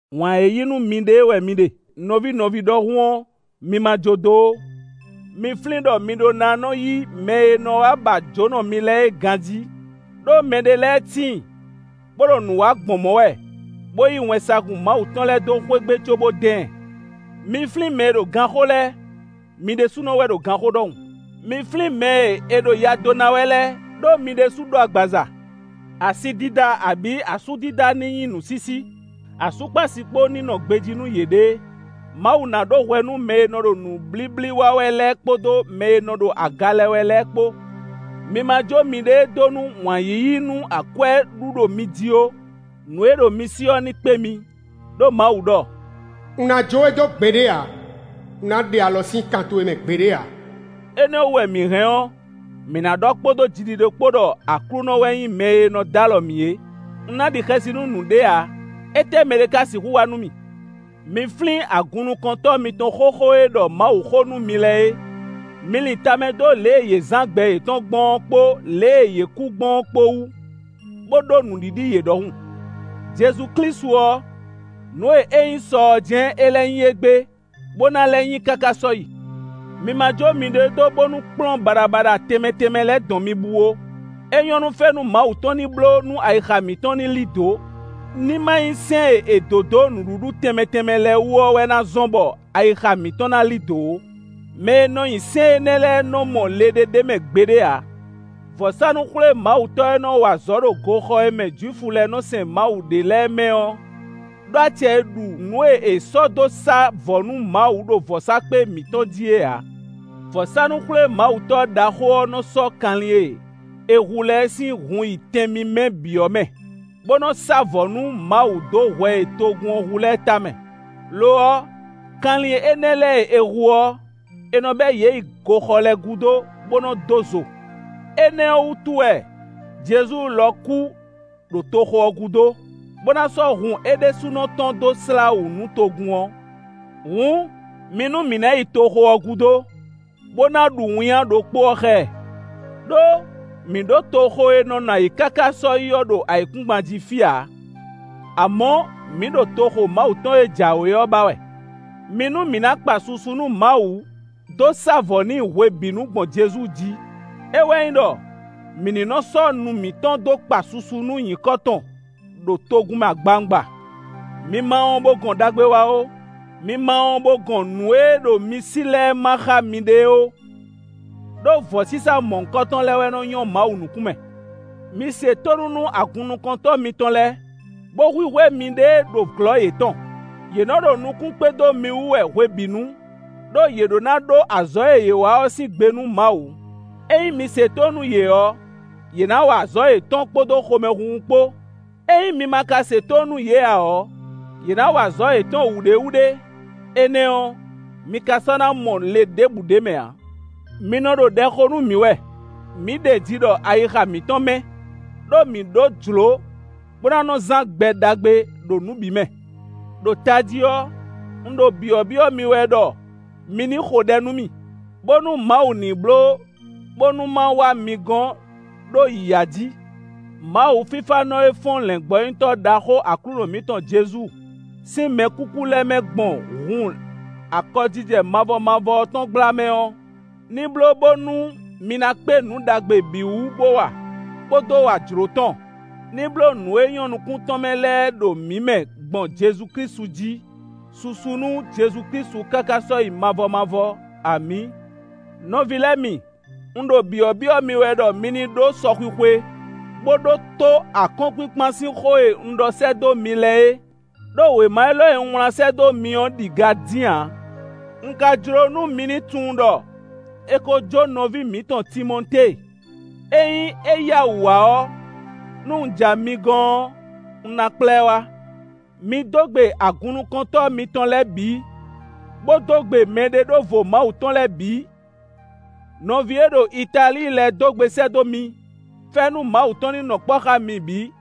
Wǎn e yí nú miɖée wɛ mi ɖe nɔví nɔví ɖɔhun ɔ́, mi ma jó dó ó. Mi flín ɖɔ mi ɖó ná nɔ yí yě mɛ e nɔ wá ba jǒnɔ mi lɛ́ɛ é ganjí, ɖó mɛɖé lɛ́ɛ tíin bó ɖo nǔ wa gbɔn mɔ̌ wɛ, bó yí wɛnsagun Mawu tɔn lɛ́ɛ dó xwé gbe cóbó dán ɛ. Mi flín mɛ e ɖo ganxó lɛ́ɛ, mi ɖésúnɔ wɛ ɖo ganxó ɖɔhun. Mi flín mɛ e è ɖo ya dó ná wɛ lɛ́ɛ, ɖó mi ɖésú ɖó agbaza. Asi dida abǐ asú dida ní nyí nǔsísí; asú kpó asi kpó ní nɔ gbejí nú yěɖée. Mawu ná ɖó hwɛ nú mɛ e nɔ ɖo nǔblíblí wa wɛ lɛ́ɛ kpódó mɛ e nɔ ɖo aga lɛ wɛ lɛ́ɛ kpó. Mi ma jó miɖée dó nú wǎn yíyí nú akwɛ́ ɖu ɖo mi jí ó; nǔ e ɖo mi sí ɔ́ ní kpé mi, ɖó Mawu ɖɔ: “Un ná jó we dó gbeɖé ǎ; un ná ɖe alɔ sín kan towe mɛ gbeɖé ǎ. Énɛ́ ɔ́ wú wɛ mǐ hɛn ɔ́, mǐ ná ɖɔ kpódó jiɖiɖe kpó ɖɔ Aklúnɔ wɛ nyí mɛ e nɔ d'alɔ mǐ é. Un ná ɖi xɛsi nú nǔɖé ǎ. Étɛ́ mɛɖé ka sixú wa nú mì.” Mi flín agunnukɔntɔ́ mitɔn xóxó e ɖɔ Mawuxó nú mi lɛ́ɛ é. Mi lin tamɛ dó lě e yě zán gbɛ yětɔn gbɔn ɔ́ kpó lě e yě kú gbɔn ɔ́ kpó wú, bó ɖó nǔɖiɖi yě ɖɔhun. Jezu Klísu ɔ́, nǔ e é nyí sɔ ɔ́ jɛ́n é lɛ́ nyí égbé, bó ná lɛ́ nyí káká sɔ́yi. Mi ma jó miɖée dó bónú kplɔ́n baɖabaɖa tɛnmɛ tɛnmɛ lɛ́ɛ dɔn mi bú ó; é nyɔ́ nú fɛ́nú Mawu tɔn ní bló nú ayixa mǐtɔn ní lí dǒ. Ní ma nyí sɛ́n e è dǒ dó nǔɖuɖu tɛnmɛ tɛnmɛ lɛ́ɛ wú ɔ́ wɛ ná zɔ́n bɔ ayixa mǐtɔn ná lí dǒ ó; mɛ e nɔ nyi sɛ́n énɛ́ lɛ́ɛ nɔ mɔ le ɖé ɖ'é mɛ gbeɖé ǎ. Vɔ̌sánú-xwlémawutɔ́ e nɔ wa azɔ̌ ɖo goxɔ e mɛ Jwifu lɛ́ɛ nɔ sɛn Mawu ɖe lɛ́ɛ mɛ ɔ́ ɖó acɛ e ɖu nǔ e è sɔ́ dó sá vɔ̌ nú Mawu ɖo vɔ̌sákpe mǐtɔn jí é ǎ. Vɔ̌sánú-xwlémawutɔ́ ɖaxó ɔ́ nɔ sɔ́ kanlin e è hu lɛ́ɛ sín hun yi Tɛn mímɛ́ bǐ ɔ́ mɛ, bó nɔ sá vɔ̌ nú Mawu dó hwɛ e togun ɔ́ hu lɛ́ɛ tamɛ. Lo ɔ́, kanlin énɛ́ lɛ́ɛ e è hu ɔ́, è nɔ bɛ yě yi goxɔ lɛ́ɛ gúdo, bó nɔ dó zo. Énɛ́ ɔ́ wútu wɛ Jezu lɔ kú ɖo toxo ɔ́ gúdo, bó ná sɔ́ hun é ɖésúnɔ tɔn dó slá wǔ nú togun ɔ́. Hǔn, mi nú mǐ ná yi toxo ɔ́ gúdo, bó ná ɖu winnyá ɖokpó ɔ́ xá ɛ. Đó mǐ ɖó toxo e nɔ nɔ ayǐ káká sɔ́yi ɔ́ ɖo ayǐkúngban jí fí ǎ; amɔ̌ mǐ ɖo toxo Mawu tɔn e jǎwe ɔ́ ba wɛ. Mi nú mǐ ná kpa susu nú Mawu dó sá vɔ̌ n'i hwebǐnu gbɔn Jezu jí; é wɛ nyí ɖɔ mǐ ní nɔ sɔ́ nu mǐtɔn dó kpa susu nú nyǐkɔ tɔn ɖo togun mɛ agbawungba. Mi ma wɔn bó gɔn ɖagbe wa ó; mi ma wɔn bó gɔn nǔ e ɖo mi sí lɛ́ɛ má xá miɖée ó, ɖó vɔ̌sísá mɔ̌hunkɔtɔn lɛ́ɛ wɛ nɔ́ nyɔ́ Mawu nukún mɛ. Mi se tónú nú agunnukɔntɔ́ mitɔn lɛ́ɛ, bó hwíhwɛ́ miɖée ɖo glɔ́ yětɔn; yě nɔ ɖo nukún kpé dó mi wú wɛ hwebǐnu, ɖó yě ɖó ná ɖó azɔ̌ e yě wa ɔ́ sín gbe nú Mawu. Ényí mi se tónú nú yě ɔ́, yě ná wa azɔ̌ yětɔn kpódó xomɛhunhun kpó; ényí mi ma ka se tónú nú yě ǎ ɔ́, yě ná wa azɔ̌ yětɔn wǔɖéwúɖé; énɛ́ ɔ́, mi ka sɔ́ ná mɔ le ɖěbǔ ɖ'é mɛ ǎ. Mi nɔ ɖo ɖɛ xo nú mǐ wɛ; mǐ ɖeji ɖɔ ayixa mǐtɔn mɛ́, ɖó mǐ ɖó jlǒ bó ná nɔ zán gbɛ ɖagbe ɖo nǔ bǐ mɛ. Đo tají ɔ́, un ɖo byɔ̌byɔ́ mi wɛ ɖɔ mi ní xo ɖɛ nú mì, bónú Mawu ní bló bónú ma wá mi gɔn ɖó yǐyá jí. Mawu fífánɔ ɔ́ fɔ́n lɛ̌ngbɔ́nyitɔ́ ɖaxó Aklúnɔ mǐtɔn Jezu sín mɛkúkú lɛ́ɛ mɛ gbɔn hun akɔjijɛ mavɔ mavɔ ɔ́ tɔn gbla mɛ ɔ́, ní bló bónú mi ná kpé nǔ ɖagbe bǐ wú bó wa, bó dó wa jlǒ tɔn; ní bló nǔ e nyɔ́ nukún tɔn mɛ lɛ́ɛ ɖo mǐ mɛ gbɔn Jezu Klísu jí. Susu nú Jezu Klísu káká sɔ́yi mavɔ mavɔ. Amǐ! Nɔví lɛ́ɛ mi, un ɖo byɔ̌byɔ́ mi wɛ ɖɔ mi ní ɖó sɔxwixwe, bó ɖótó akɔ́nkpinkpan sín xó e un ɖɔ sɛ́ dó mi lɛ́ɛ é; ɖó wěma élɔ́ e un wlán sɛ́ dó mi ɔ́ ɖi ga dín ǎ. Un ka jló nú mi ní tunwun ɖɔ è ko jó nɔví mǐtɔn Timɔtée. Ényí é yá wǔ wá ɔ́, nú un ja mi gɔn ɔ́, un ná kplá ɛ wá. Mi dó gbe agunnukɔntɔ́ mitɔn lɛ́ɛ bǐ, bó dó gbe mɛɖeɖóvo Mawu tɔn lɛ́ɛ bǐ. Nɔví e ɖo Italíi lɛ́ɛ dó gbe sɛ́ dó mi. Fɛ́nú Mawu tɔn ní nɔ kpɔ́ xá mi bǐ.